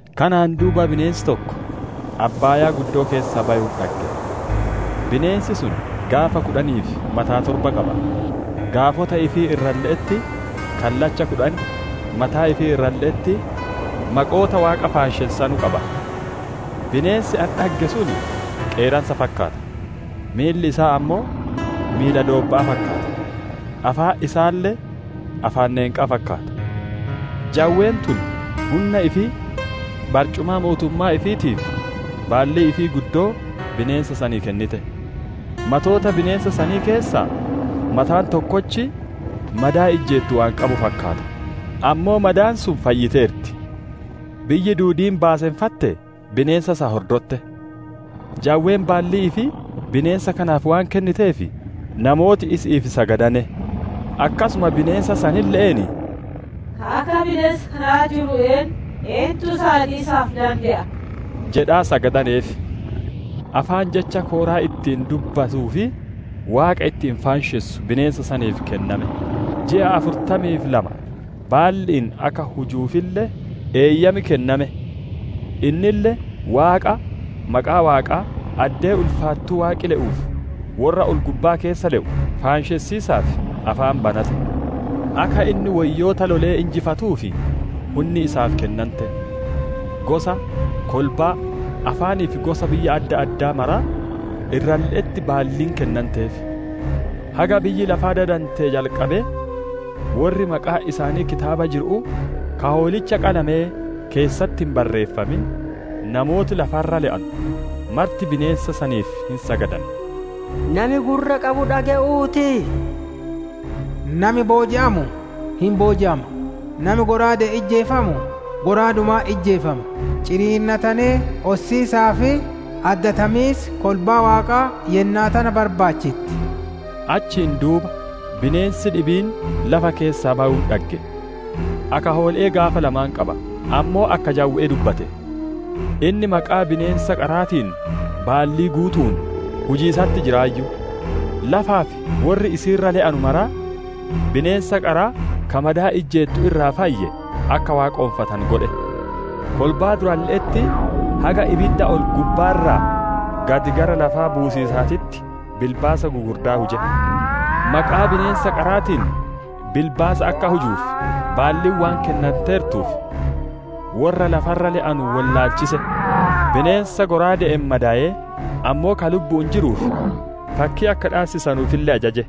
Kanaan duuba bineensi tokko abbaayaa keessaa bayuun dhagge. Bineensi sun gaafa kudhanii fi mataa torba qaba; gaafota ifii irralle'etti kallacha kudhan, mataa ifii irralle'etti maqoota Waaqa faanshessanu qaba. Bineensi ani dhagge sun qeeransa fakkaata; miilli isaa ammoo miila doobba'aa fakkaata, afaan isaalle afaan neenqaa fakkaata. Jawween tun hunna ifii, barcumaa mootummaa ifiitii fi baallii ifii guddoo bineensa sanii kennite. Matoota bineensa sanii keessaa mataan tokkochi madaa ijjeettu waan qabu fakkaata; ammoo madaan sun fayyiteerti. Biyyi duudiin baaseffattee, bineensa san hordotte. Jawween baallii ifii bineensa kanaaf waan kenniteef, namooti isi'iif sagadane; akkasuma bineensa sanille'een, «Ka akka bineensa kanaa jiru eennu? Eentu isa loliisaaf dande'a?» jedhaa sagadaneef. Afaan jecha kooraa ittiin dubbatuu fi Waaqa ittiin faanshessu bineensa saniif kenname; ji'a afurtamii fi lama baalli'iin akka hujuufille eeyyam kenname. Innille Waaqa, maqaa Waaqaa, addee ulfaattuu Waaqi le'uu fi worra ol-gubbaa keessa le'u faanshessiisaaf afaan banate. Akka inni woyyoota lolee injifatuuf hunni isaaf kennante. Gosa, kolbaa, afaanii fi gosa biyya adda addaa mara irralle'etti baalliin kennanteef. Haga biyyi lafaa dadantee jalqabee, worri maqaan isaanii kitaaba jiru'uu ka Hoolicha qalamee keessatti hin barreeffamin, namooti lafa irra le'anu marti bineensa saniif hin sagadan. Nami gurra qabu dhage'uu ti! Nami booji'amu, hin booji'ama; nami shallaaga'aan ijjeefamu shallaagumaan ijjeefama. Ciniinnatanee ossiisaa fi addatamiisi kolbaa Waaqaa yennaa tana barbaachitti. Achiin duuba bineensi dhibiin lafa keessaa bayuun dhagge. Akka hoole'ee gaafa lama qaba, ammoo akka jawwe'ee dubbate. Inni maqaa bineensa qaraatiin baallii guutu'uun hujiisatti jiraayyu; lafaa fi worri isii irra le'anu maraa, bineensa qaraa ka madaa ijjeettu irraa fayye akka waaqonfatanu godhe. Kolbaa duralle'etti haga ibidda ol-gubbaa irraa gad gara lafaa buusiisaatitti bilbaasa gugurddaa huje. Maqaa bineensa qaraatiin bilbaasa akka hujuuf baalliin waan kennanteertuuf, worra lafa irra le'anu wollaalchise; bineensa shallaaga'aan madayee, ammoo ka lubbu'uun jiruuf, fakkii akka dhaassisanuufille ajaje.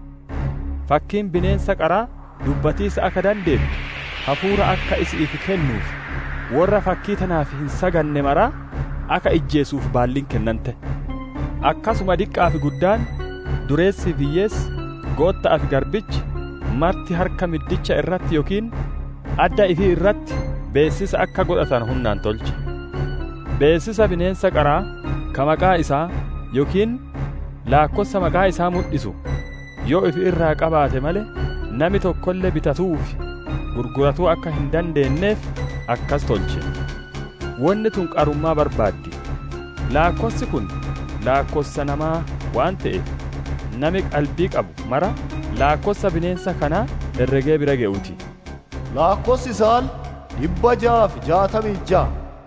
Fakkiin bineensa qaraa dubbatiisa akka dandeettu hafuura akka isi'iif kennuu fi worra fakkii tanaaf hin saganne maraa akka ijjeesisuuf baalliin kennante. Akkasuma diqqa'aa fi guddaan, dureessii fi hiyyeessi, gootta'aa fi garbichi marti harka middicha irratti yookiin adda ifii irratti beessisa akka godhatanu hunnaan tolche. Beessisa bineensa qaraa ka maqaa isaa yookiin laakkossa maqaa isaa mudhisu, yoo ifi irraa qabaate malee, nami tokkolle bitatu'uu fi gurguratuu akka hin dandeenneef akkasi tolche. Wonni tun qarummaa barbaaddi. Laakkossi kun laakkossa namaa waan te'eef, nami qalbii qabu maraa laakkossa bineensa kanaa herregee bira gewuu ti; laakkossi isaalle, dhibba jaa fi jaatamii fi ja.